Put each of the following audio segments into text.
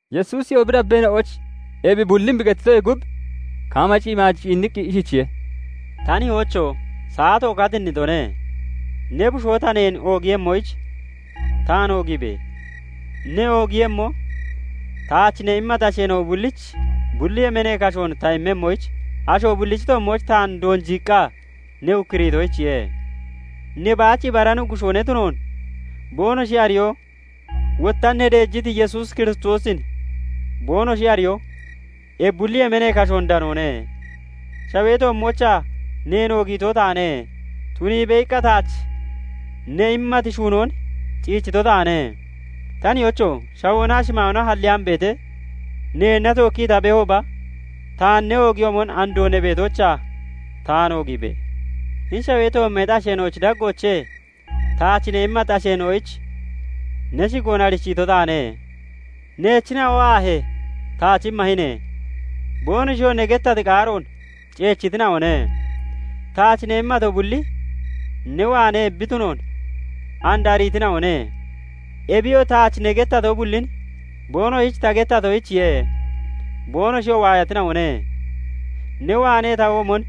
Yesuusiyoo bi dabbeena'oyich ebi bullin bi gettitoyee gub, kaama shimaaj ciinniqqi ishichiye:- "Ta Nihoocho! Saato katinnitone; ne Bushoo ta neen oogiiyemmoyich taan oogiibe! Ne oogiiyemmoo, taach ne immati asheena'o bullich bulli yemeenee kashoon ta immemmoyich, asho bullichi toommooch taan doonjiiqqa ne ukkuriitoyichiye. Ne baach ibara Nuggushoo ne tunoon boonoshi ariyo, wotta ne deejiti Yesuus Kiristoosin boonoshi ariyoo, ebi bulli yemeenee kashoon danoone. Shawee toommoochaa neen oogiito taane; 'Tuniibe!' iqqa taach ne immati shuunoon ciichito taane. Ta Nihoocho! Shawoonaa shimaayoona halleyaan beetee, neenna tookkii ta beehooba taan ne oogiyoomon andoo ne beetoochaa taan oogiibe! "Hini shawee toommeexi asheena'ochi daggoochee taach ne immati asheena'oyich ne shigoon arichiito taane. Neechina'o aahee, taach immahine; boonoshiyoo ne gettati qaaroon ceechitina'one. Taach ne immato bulli ne waanee bi tunoon and ariitina'one. Ebiyoo taach ne gettato bullin boonoshich ta gettatoyichiye; boonoshiyoo waayatina'one; ne waanee ta womon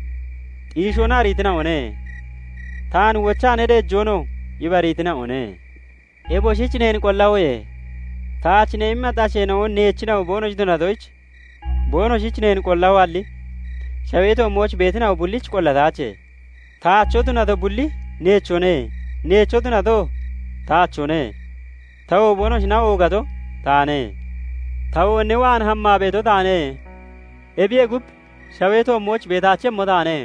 xiishoona ariitina'one; taan wochaa ne deejoonoo ibariitina'one. "Eboshich neen qollahoye; taach ne immati asheena'o neechina'o boonoshi tunatoyich, boonoshich neen qollahoalli, shawee toommooch beetina'o bullich qollataache. Taacho tunato bulli neechone; neecho tunatoo taachone; tawoo boonoshina oogato taane. Tawo ne waan hammaa beeto taane; ebiyee gub, shawee toommooch beetaachemmo taane;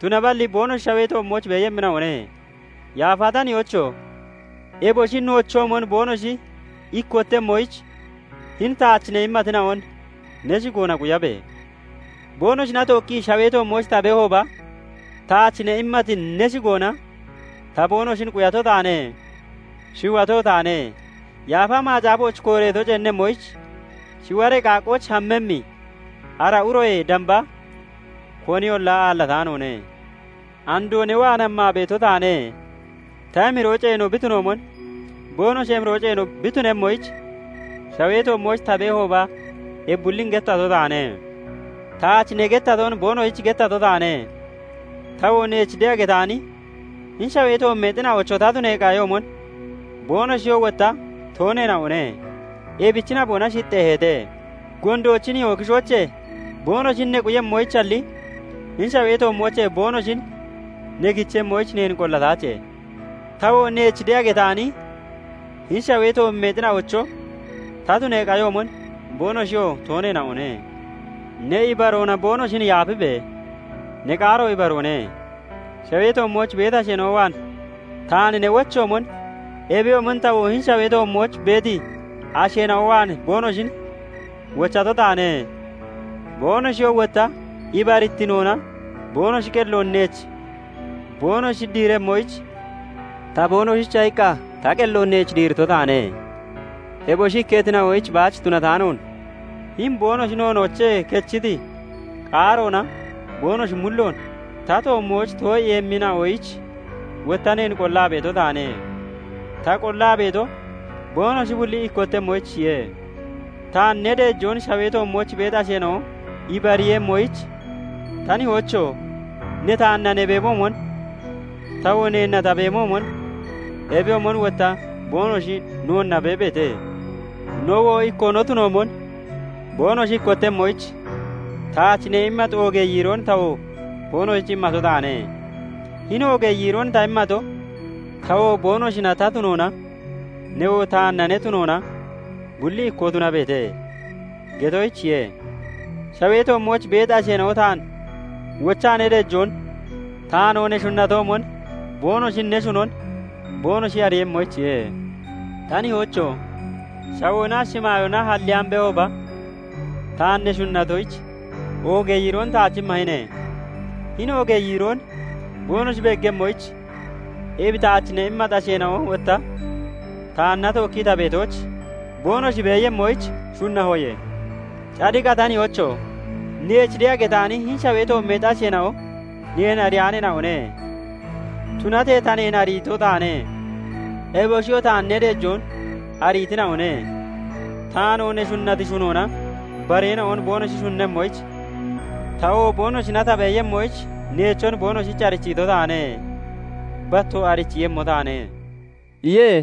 tunaballi boonoshi shawee toommooch beeyemmina'one. Yaafa ta Nihoocho! Eboshi noochoomon boonoshi ikkottemmoyich, hini taach ne immatina'on ne shigoona quyabe! Boonoshina tookkii shawee toommooch ta beehooba, taach ne immati ne shigoona ta boonoshin quyato taane; shiwato taane; Yaafa Macaafooch kooreeto ceennemmoyich, shiwaree qaaqqooch hammemmi ara uroyee damba koniyolla aallataanoone. "Andoo ne waan hammaa beeto taane; ta emiroo ceeno bi tunoomon boonoshi emiroo ceeno bi tunemmoyich, shawee toommooch ta beehooba ebi bullin gettato taane. Taach ne gettaton boonoshich gettato taane. Tawoo neech de'a getaani hini shawee toommeexina'ocho ta tunee qayoomon, boonoshiyoo wotta tooneena'one; ebichi naboona shixxeeheete. Gondoochi nihoo kishoochee boonoshin ne quyemmoyichalli, hini shawee toommoochee boonoshin ne kichemmoyich neen qollataache. Tawoo neech de'a getaani hini shawee toommeexina'ocho ta tunee qayoomon boonoshiyoo tooneena'one. Ne ibaroona boonoshin yaafibe! Ne qaaro ibaroone. Shawee toommooch beeti asheena'o waan taan ne wochoomon, ebiyoomon tawoo hini shawee toommooch beeti asheena'o waan boonoshin wochato taane. Boonoshiyoo wotta ibarittinoona boonoshi qelloon neech boonoshi diiremmoyich ta boonoshicha iqqa ta qelloon neech diirito taane. "Eboshi ikketina'oyich baach tunataanoon, hini boonoshi noonoochee kechiti qaaroona boonoshi mulloon ta toommooch too'iiyemmina'oyich wotta neen qollaa beeto taane; Ta qollaa beeto, boonoshi bulli ikkottemmoyichiye; taan ne deejoon shawee toommooch beeti asheena'o ibariiyemmoyich, ta Nihoocho! Ne taanna ne beemoomon, tawoo neenna ta beemoomon, ebiyoomon wotta boonoshi noonna beebeete. Nowoo ikkoo no tunoomon boonoshi ikkottemmoyich, taach ne immati oogee yiiroon tawoo boonoshich immato taane; hini oogee yiiroon ta immato, 'Tawoo boonoshina ta tunoona, newoo taanna ne tunoona bulli ikkoo tunabeete' getoyichiye; shawee toommooch beeti asheena'o taan wochaa ne deejoon, taanoo ne shunnatoomon boonoshin ne shunon boonoshi ariiyemmoyichiye. "Ta Nihoocho! Shawoonaa shimaayoona halleyaan beehooba, taan ne shunnatoyich, oogee yiiroon taach immahine; hini oogee yiiroon boonoshi beeggemmoyich, ebi taach ne immati asheena'o wotta taanna tookki ta beetooch boonoshi beeyemmoyich shunnahoye. "Cadiqa ta Nihoocho! Neech de'a getaani hini shawee toommeexi asheena'o neen ariyaaneena'one; tunatee ta neen ariito taane; eboshiyoo taan ne deejoon ariitina'one. Taanoo ne shunnati shunoona bareena'on boonoshi shunnemmoyich, tawoo boonoshina ta beeyemmoyich neechon boonoshich arichiito taane; battoo arichiiyemmo taane" iye.